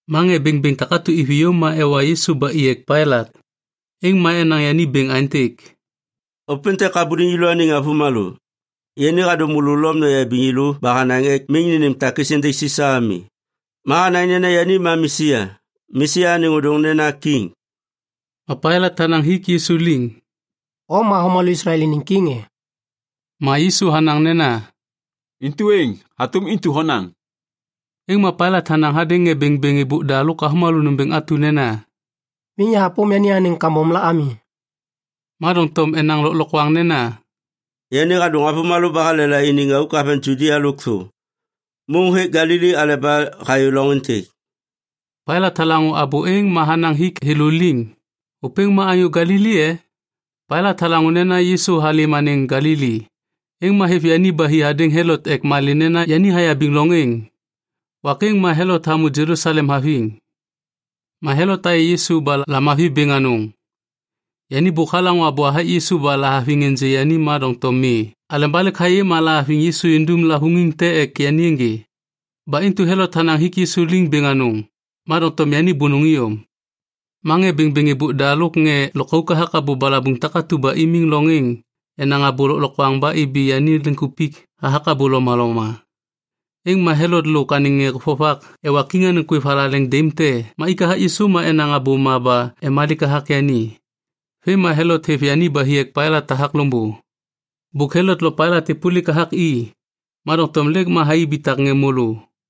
Ma ŋê bêŋbêŋ takatu iviyô ma ewa Yisu ba i ek Pailat. Êŋ ma enaŋ yani bêŋ aêntêk, “Ôpêntêk habuliŋ yêlôaniŋ avômalô. Yani hadô môlô Lom noyabiŋ yêlô ba hanaŋ ek miŋ nênêm takis êndêŋ Sisa ami. Ma hanaŋ nena yani ma Mesia. Mesia anêŋ ôdôŋ nena kiŋ.” Ma Pailat hanaŋ hik Yisu liŋ, “O ma avômalô Islael iniŋ kiŋ e?” Ma Yisu hanaŋ nena, “Intu êŋ, hatôm intu honaŋ.” Êŋ ma Pailat hanaŋ hadêŋ ŋê bêŋbêŋ êbôk da lôk avômalô nômbêŋ atu nena, “Miŋ yahapôm yani anêŋ kambom la ami.” Ma doŋtom enaŋ lôklokwaŋ nena, “Yani hadôŋ avômalô ba halela iniŋ auk haveŋ Judia lôkthô. Môŋ hêk Galili aleba hayô loŋ êntêk.” Pailat halaŋô abô êŋ ma hanaŋ hik thêlô liŋ, “Ôpêŋ ma anyô Galili e?” Pailat halaŋô nena Yisu halêm anêŋ Galili, êŋ ma hêv yani hi hadêŋ Helot ek malê nena yani hayabiŋ loŋ êŋ. Wak êŋ ma Helot hamô Jelusalem haviŋ. Ma Helot hayê Yisu ba lamavi bêŋ anôŋ. Yani bôk halaŋô abô hathak Yisu ba lahaviŋ ênjê yani ma doŋtom mi aleba lêk hayê ma lahaviŋ Yisu indum lavôŋiŋ te ek yani ênjê. Ba intu Helot hanaŋ hik Yisu liŋ bêŋ anôŋ, ma doŋtom yani bônôŋ iyom. Ma ŋê bêŋbêŋ êbôk da lôk ŋê lôkauk hathak abô balabuŋ takatu ba imiŋ loŋ êŋ enaŋ abô lôklokwaŋ ba ibi yani liŋkupik hathak abô lomaloma. Êŋ ma Helot lôk anêŋ ŋê vovak ewa kiŋ anêŋ kwêv thalaleŋ daim te ma ik hathak Yisu ma enaŋ abôma ba emalik hathak yani. Vêm ma Helot hêv yani ba hi ek Pailat hathak loŋbô. Bôk Helot lo Pailat êpôlik hathak i, ma doŋtom lêk ma thai ibitak ŋê môlô.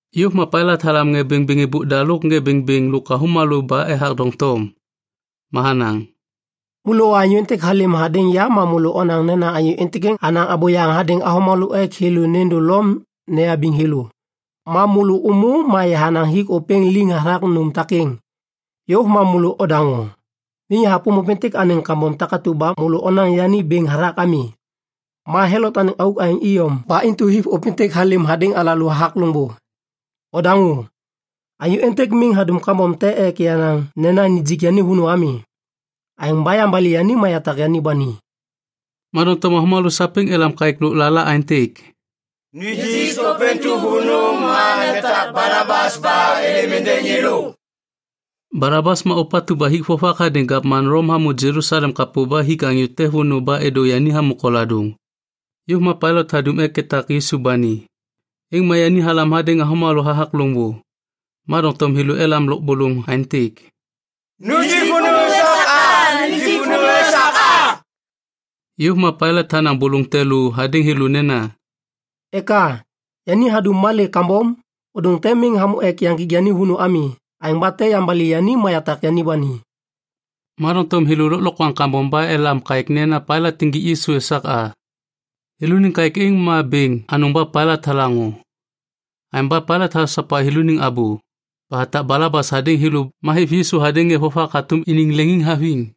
Yôv ma Pailat halam ŋê bêŋbêŋ êbôk da lôk ŋê bêŋbêŋ lôk avômalô ba ethak doŋtom. Ma hanaŋ, “Môlôwa anyô êntêk halêm hadêŋ ya ma môlô onaŋ nena anyô êntêk hanaŋ abôyaŋ hadêŋ avômalô ek thêlô nêndô Lom eyabiŋ thêlô. Ma môlô ômô ma yahanaŋ hik ôpêŋ liŋ hathak nôm takêŋ. Yôv ma môlô odaŋô. Miŋ yahapôm ôpêntêk anêŋ kambom takatu ba môlô onaŋ yani bêŋ hathak ami. Ma Helot anêŋ auk aêŋ iyom ba intu hêv ôpêntêk halêm hadêŋ alalô hathak loŋbô. Odaŋô. Anyô êntêk miŋ hadum kambom te ek yanaŋ nena nijik yani vônô ami. Aêŋ ba yambali yani ma yatak yani ba ni.” Ma doŋtom avômalô sapêŋ elam kaêk lôklala aêntêk, “Nijik ôpêntu vônô ma netak Balabas ba êlêm êndêŋ yêlô.” (Balabas ma ôpatu ba hik vovak hadêŋ gavman Lom hamô Jelusalem kapô ba hik anyô te vônô ba êdô yani hamô koladôŋ.) Yôv ma Pailat hadum ek etak Yisu ba ni. Êŋ ma yani halam hadêŋ avômalô hathak loŋbô. Ma doŋtom thêlô elam lôbôlôŋ aêntêk, “Nijik vônô esak a! Nijik vônô esak a!” Yôv ma Pailat hanaŋ bôlôŋ te lô hadêŋ thêlô nena, “Eka? Yani hadum malê kambom? Ôdôŋ te miŋ hamô ek yaŋgik yani vônô ami. Aêŋ ba tem yambali yani ma yatak yani ba ni.” Ma doŋtom thêlô lôklokwaŋ kambom ba elam kaêk nena Pailat injik Yisu esak a. Thêlôniŋ kaêk êŋ ma bêŋ anôŋ ba Pailat halaŋô. Aêŋ ba Pailat hasopa thêlôniŋ abô ba hatak Balabas hadêŋ thêlô ma hêv Yisu hadêŋ ŋê vovak hatôm iniŋ leŋiŋhaviŋ.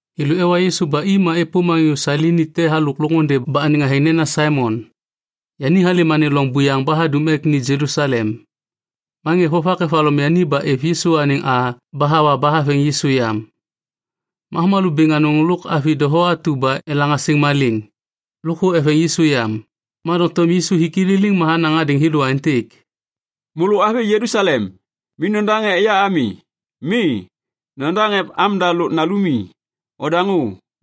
Thêlô ewa Yisu ba i ma êpôm anyô Sailini te halôk loŋôndê ba anêŋ athêŋ nena Saimon. Yani halêm anêŋ loŋ buyaŋ ba hadum ek ni Jelusalem. Ma ŋê vovak evaloŋ yani ba êv Yisu anêŋ a ba hawa ba haveŋ Yisu yam. Ma avômalô bêŋ anôŋ eveŋ Yisu yam, lôk avi doho elaŋ asêŋ malêŋ ba eveŋ yani yam. Ma doŋtom Yisu hik i liliŋ ma hanaŋ hadêŋ thêlô aêntêk, “Môlô avi Jelusalem, miŋ nodaŋ ek ya ami. Mi, nodaŋ ek amda lôk nalumi. Odaŋô,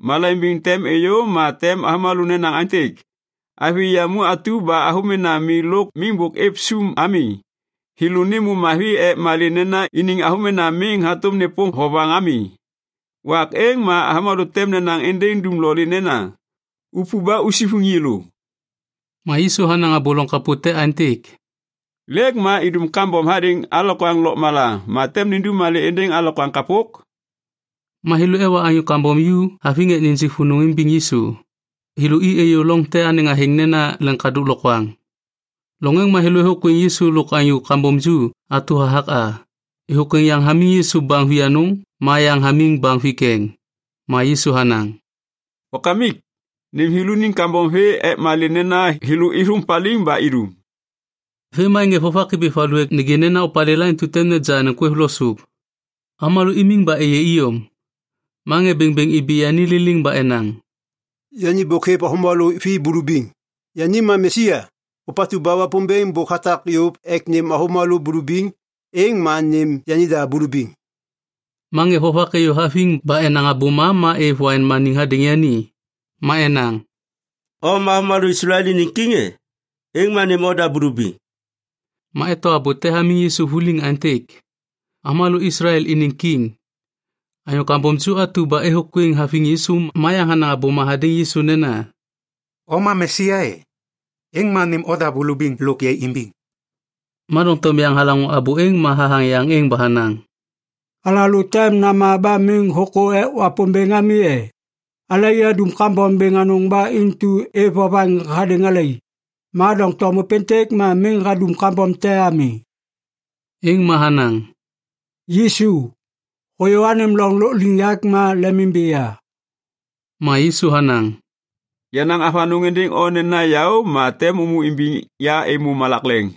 malaiŋ bêŋ tem êyô ma tem avômalô nenaŋ aêntêk, ‘Avi yamu atu ba avômena mi lôk miŋ bôk êv sum ami, thêlô nêmô mavi ek malê nena iniŋ avômena miŋ hatôm nêpôm vovaŋ ami.’ Wak êŋ ma avômalô tem nenaŋ êndêŋ dumlolê nena, ‘Upu ba usivuŋ yêlô.’” Ma Yisu hanaŋ abô loŋ kapô te aêntêk, “Lêk ma idum kambom hadêŋ alokwaŋ lôkmala ma tem nindum malê êndêŋ alokwaŋ kapok?” Ma thêlô ewa anyô kambom ju haviŋ ek nijik vônô imbiŋ Yisu. Thêlô i êyô loŋ te ba anêŋ athêŋ nena Leŋkadôk Lokwaŋ. Loŋ êŋ ma thêlô êthôkwêŋ Yisu lôk anyô kambom ju atu hathak a. Êthôkwêŋ yaŋ hamiŋ Yisu baŋ vianôŋ ma yaŋ hamiŋ baŋ vikeŋ. Ma Yisu hanaŋ, “Wakamik, nêm thêlôniŋ kambom vê ek malê nena thêlô êthôŋ paliŋ ba idum.” Vêm ma ŋê vovak ibi valu ek nêgê nena opalêla intu tem neja anêŋ kwêv lo sôp. Avômalô imiŋ ba êyê iyom. Ma ŋê bêŋbêŋ ibi yani liliŋ ba enaŋ, “Yani bôk hêv avômalô vi bulubiŋ. Yani ma Mesia, ôpatu ba Wapômbêŋ bôk hatak yôv ek nêm avômalô bulubiŋ, êŋ ma nêm yanida bulubiŋ.” Ma ŋê vovak êyô haviŋ ba enaŋ abôma ma êv waiŋ maniŋ hadêŋ yani. Ma enaŋ, “O ma avômalô Islael iniŋ kiŋ e? Êŋ ma nêm oda bulubiŋ.” Ma eto abô te hamiŋ Yisu vuliŋ aêntêk, AVÔMALÔ ISLAEL INIŊ KIŊ Anyô kambom ju atu ba êthôkwêŋ haviŋ Yisu ma yaŋ hanaŋ abôma hadêŋ Yisu nena, “O ma Mesia e? Êŋ ma nêm oda bulubiŋ lôk yai imbiŋ.” Ma doŋtom yaŋ halaŋô abô êŋ ma hathaŋ yaŋ êŋ ba hanaŋ, “Alalô tem nama ba miŋ hôkô ek Wapômbêŋ ami e? Alai adum kambom bêŋ anôŋ ba intu êv vovaŋ hadêŋ alai, ma doŋtom ôpêntêk ma miŋ hadum kambom te ami.” Êŋ ma hanaŋ, “Yisu, hôyô anêm loŋ lôkliŋyak ma lemimbi ya.” Ma Yisu hanaŋ, “Yanaŋ avanôŋ êndêŋ o nena yaô ma tem ômô imbiŋ ya êmô malak leŋ.”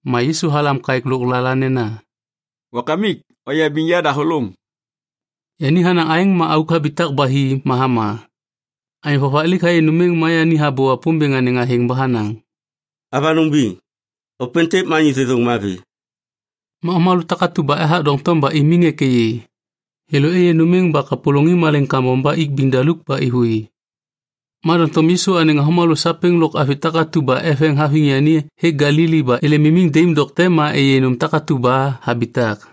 Ma Yisu halam kaêk lôklala nena, “Wakamik, oyabiŋ yadahôlôŋ.” Yani hanaŋ aêŋ ma auk habitak ba hi ma hama. Anyô vovak laik hayê nôm êŋ ma yani habô Wapômbêŋ anêŋ athêŋ ba hanaŋ, “Avanôŋ biŋ, ôpêntêk ma anyô thêthôŋ mavi.” Ma avômalô takatu ba ethak doŋtom ba imiŋ ek êyê, thêlô êyê nôm êŋ ba kapôlôŋiŋ malaiŋ kambom ba ik biŋ daluk ba êvôi. Ma doŋtom Yisu anêŋ avômalô sapêŋ lôk avi takatu ba eveŋ haviŋ yani hêk Galili ba êlêm imiŋ daim dokte ma êyê nôm takatu ba habitak.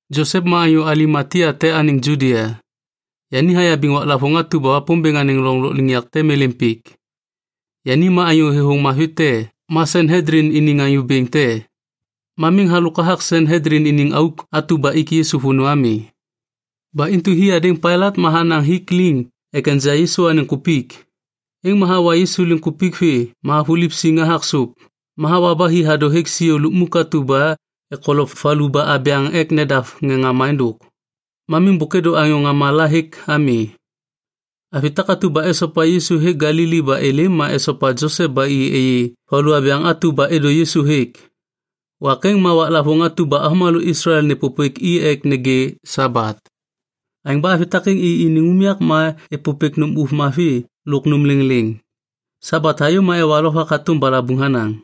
Josep ma anyô Alimatia te anêŋ Judia. Yani hayabiŋ waklavôŋ atu ba Wapômbêŋ anêŋ loŋ lôkliŋyak tem êlêm pik. Yani ma anyô thêthôŋ mavi te ma Sanhedlin iniŋ anyô bêŋ te. Ma miŋ halôk hathak Sanhedlin iniŋ auk atu ba ik Yisu vônô ami. Ba intu hi hadêŋ Pailat ma hanaŋ hik liŋ ek enja Yisu anêŋ kupik. Êŋ ma hawa Yisu liŋkupik vê ma havuliv siŋ hathak sôp, ma hawa ba hi hadô hêk siô lukmuk atu ba ekolop valu ba abyaŋ ek nedav ŋê ŋama êndôk. Ma miŋ bôk êdô anyô ŋama la hêk ami. Avi takatu ba esopa Yisu hêk Galili ba êlêm, ma esopa Josep ba i êyê valu abyaŋ atu ba êdô Yisu hêk. Wak êŋ ma waklavôŋ atu ba avômalô Islael nêpôpêk i ek nêgê Sabat. Aêŋ ba avi takêŋ i iniŋ unyak ma êpôpêk nôm ôv mavi lôk nôm lêŋlêŋ. Sabat hayô ma ewa lovak hatôm balabuŋ hanaŋ.